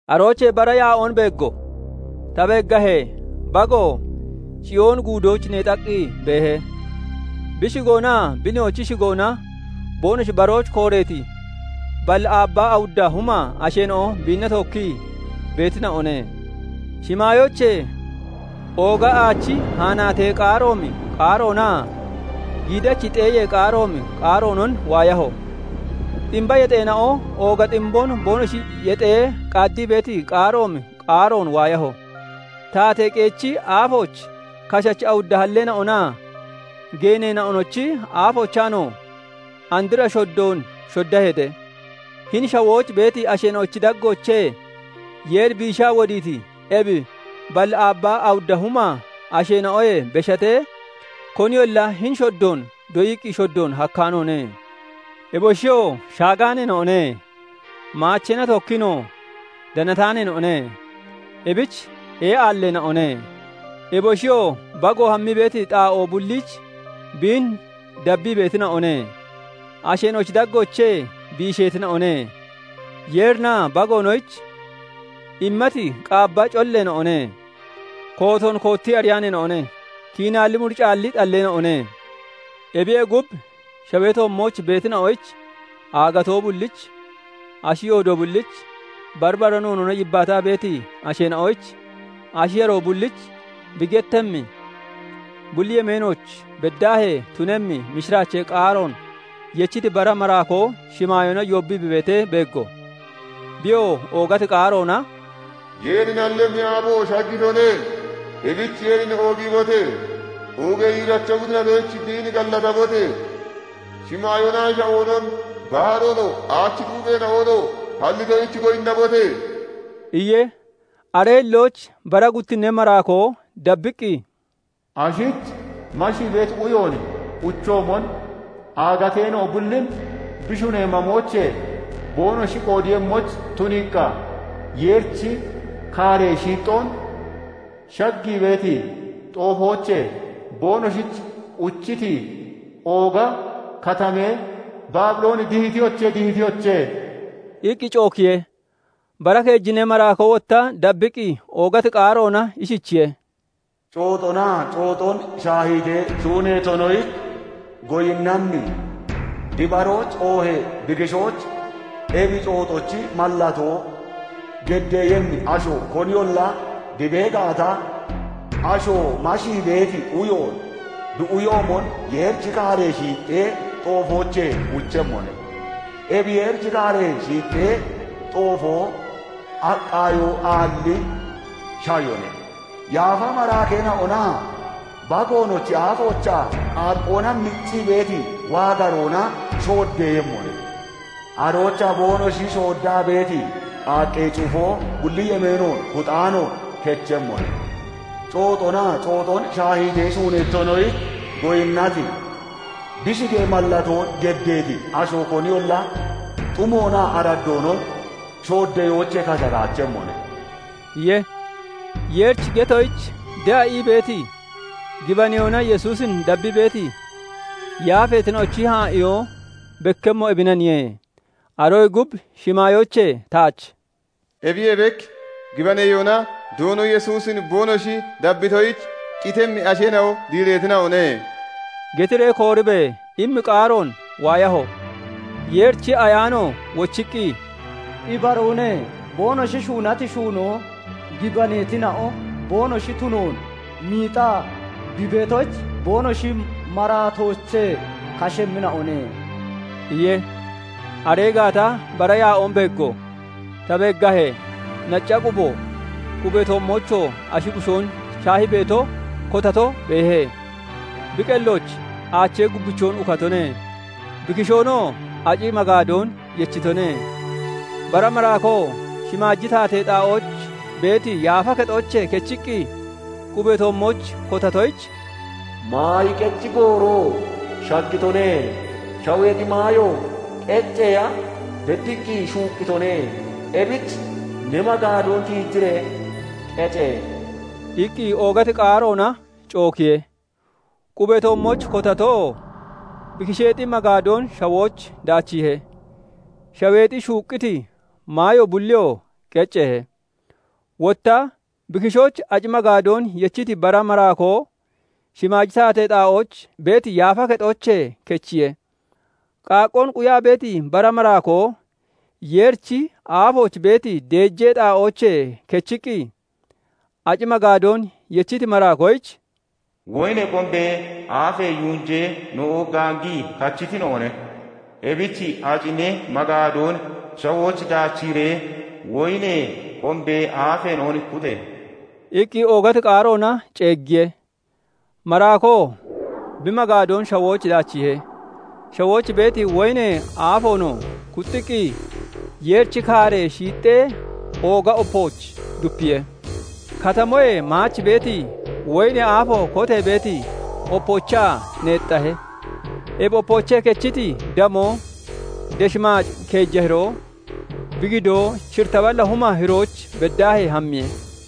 Aroochee bara yaa'oon beeggo; ta beeggahee, Bago Ciyooni Guudooch neexaqqi beehe; bi shigoonaa bi Nihoochi shigoona boonoshi barooch kooreeti balli aabbaa awudda huma asheena'o biinna tookkii beetina'one. Shimaayoochee ooga aachi haanaatee qaaroomi qaaroonaa giidachi xeeyee qaaroomi qaaroonon waayaho; ximba yexeena'o ooga ximboon boonoshi yexee qaaddii beeti qaaroomi qaaroon waayaho. Taatee qeechi aafooch, kashachi awudda halleena'onaa geeneena'onochi aafoochaanoo andra shoddoon shoddaheete; hini shawooch beeti asheena'ochi daggoochee Yeeri biishaa wodiiti ebi balli aabbaa awudda huma asheena'oyee beshatee, koniyolla hini shoddoon doyiqqi shoddoon hakkaanoone. Eboshiyoo shaagaaneena'one; maacheena tookkiinoo danataaneena'one; ebich ee'aalleena'one. Eboshiyoo Bago hammii beeti xaa'oo bulliich biin dabbii beetina'one; asheena'ochi daggoochee biisheetina'one; Yeerinaa Bagoonoyich immati qaabba colleena'one; kootoon koottii ariyaaneena'one; kiinaalli muricaalli xalleena'one. Ebiyee gub, shawee toommooch beetina'oyich, aagatoo bullich, ashi yoodo bullich, bari bara noonoona yibbaataa beeti asheena'oyich, ashi yaroo bullich bi gettemmi, bulli yemeenooch beddaahee tunemmi mishiraachee qaaroon yechiti bara maraakoo shimaayoona yoobbii bi beetee beeggo; biyoo oogati qaaroona "Yeeri nallemmi aabo shaggitone; ebich Yeerin oogiibote! Oogee yiiracho bi tunatoyich biin gallatabote! Shimaayoonaa shawoonon, baharoonoo, aachi xuupheena'onoo hallitoyich goyinnabote!" iye. Aree hillooch bara guttinnee maraakoo dabbiqqi, "Ashich mashii beeti uyoon uchoomon, aagateena'o bullin bi shunee mamoochee boonoshi qoodeeyemmoyich tuniiqqa, Yeerichi kaaree shiixxoon shaggii beeti xoofoochee boonoshich uchiti ooga katamee Baabilooni dihitiyoche! Dihitiyoche!" iqqi cookiye. Bara keejinnee maraakoo wotta dabbiqqi oogati qaaroona ishichiye:- "Cooxonaa cooxon shaahiitee shuuneetonoyich goyinnammi, bi barooch oohee bi kishooch ebi cooxochi mallatoo geddeeyemmi asho koniyolla bi bee gaata, asho mashii beeti uyoon bi uyoomon Yeerichi kaaree shiixxee xoofoochee uchemmone; ebi Yeerichi kaaree shiixxee xoofoo aqqaayoo aalli shayone; yaafa maraakeena'onaa Bagoonochi aafoochaa qaaqqoonaa miccii beeti waagaroona shooddeeyemmone. Aroochaa boonoshi shooddaa beeti qaaqqee cufoo bulli yemeenoon kuxaanoon kechemmone; cooxonaa cooxon shaahiitee shuuneetonoyich goyinnati, bi shigee mallatoon geddeeti asho koniyolla xumoonaa araddoonon shooddeyoochee kashataachemmone" iye. Yeerichi getoyich de'a ii beeti, gibaneyoona Yesuusin dabbii beeti yaafeena'ochi haa'iyoo bekkemmo ebinaniye. Aroyee gub shimaayoochee taach "Ebiyee bek gibaneyoona Doono Yesuusin boonoshi dabbitoyich qitemmi asheena'o diireetina'one" getiree kooribe! immi qaaroon waayaho. Yeerichi Ayaano wochiqqi, "Ibaroone; boonoshi shuunati shuunoo gibaneetina'o boonoshi tunoon miixaa bi beetoyich, boonoshi maraatoochee kashemmina'one" iye. Aree gaata bara yaa'oon beeggo; ta beeggahee, nacca qubo, qubee toommoochoo ashi bushoon shaahii beeto kotato beehe; bi qellooch aachee gubbichoon ukatone; bi kishoonoo aci magaadoon yechitone. Bara maraakoo shimaaji taatee xaa'ooch beeti yaafa kexoochee kechiqqi qubee toommooch kotatoyich, "Maayi qeci gooroo shaggitone; shaweexi maayo qecceya beddiqqi shuuqqitone; ebich ne magaadoon tiijiree qece!" iqqi oogati qaaroona cookiye. Qubee toommooch kotatoo bi kisheexi magaadoon shawooch daachiihe; shaweexi shuuqqiti maayo bulliyoo qecceehe. Wotta bi kishooch aci magaadoon yechiti bara maraakoo shimaaji taatee xaa'ooch beeti yaafa kexoochee kechiye. Qaaqqoon quyaa beeti bara maraakkoo Yeerichi aafooch beeti deejee xaa'oochee kechiqqi, aci magaadoon yechiti maraakoyich "Woyinee qombee aafee yunjeena'o gaangii kachitina'one; ebich aci ne magaadoon shawooch daachiiree woyinee qombee aafeena'on kuxe!" iqqi oogati qaaroona ceeggiye. Maraakoo bi magaadoon shawooch daachiihe; shawooch beeti woyinee aafoonoo kuxxiqqi, Yeerichi kaaree shiixxee ooga opooch dupiye. Katamoyee maach beeti, woyinee aafo kotee beeti opoochaa neexxahe; ebi opoochee kechiti damoo desh maac keeja hiroo, bi gidoo shiritta balla huma hirooch beddaahee hammiye.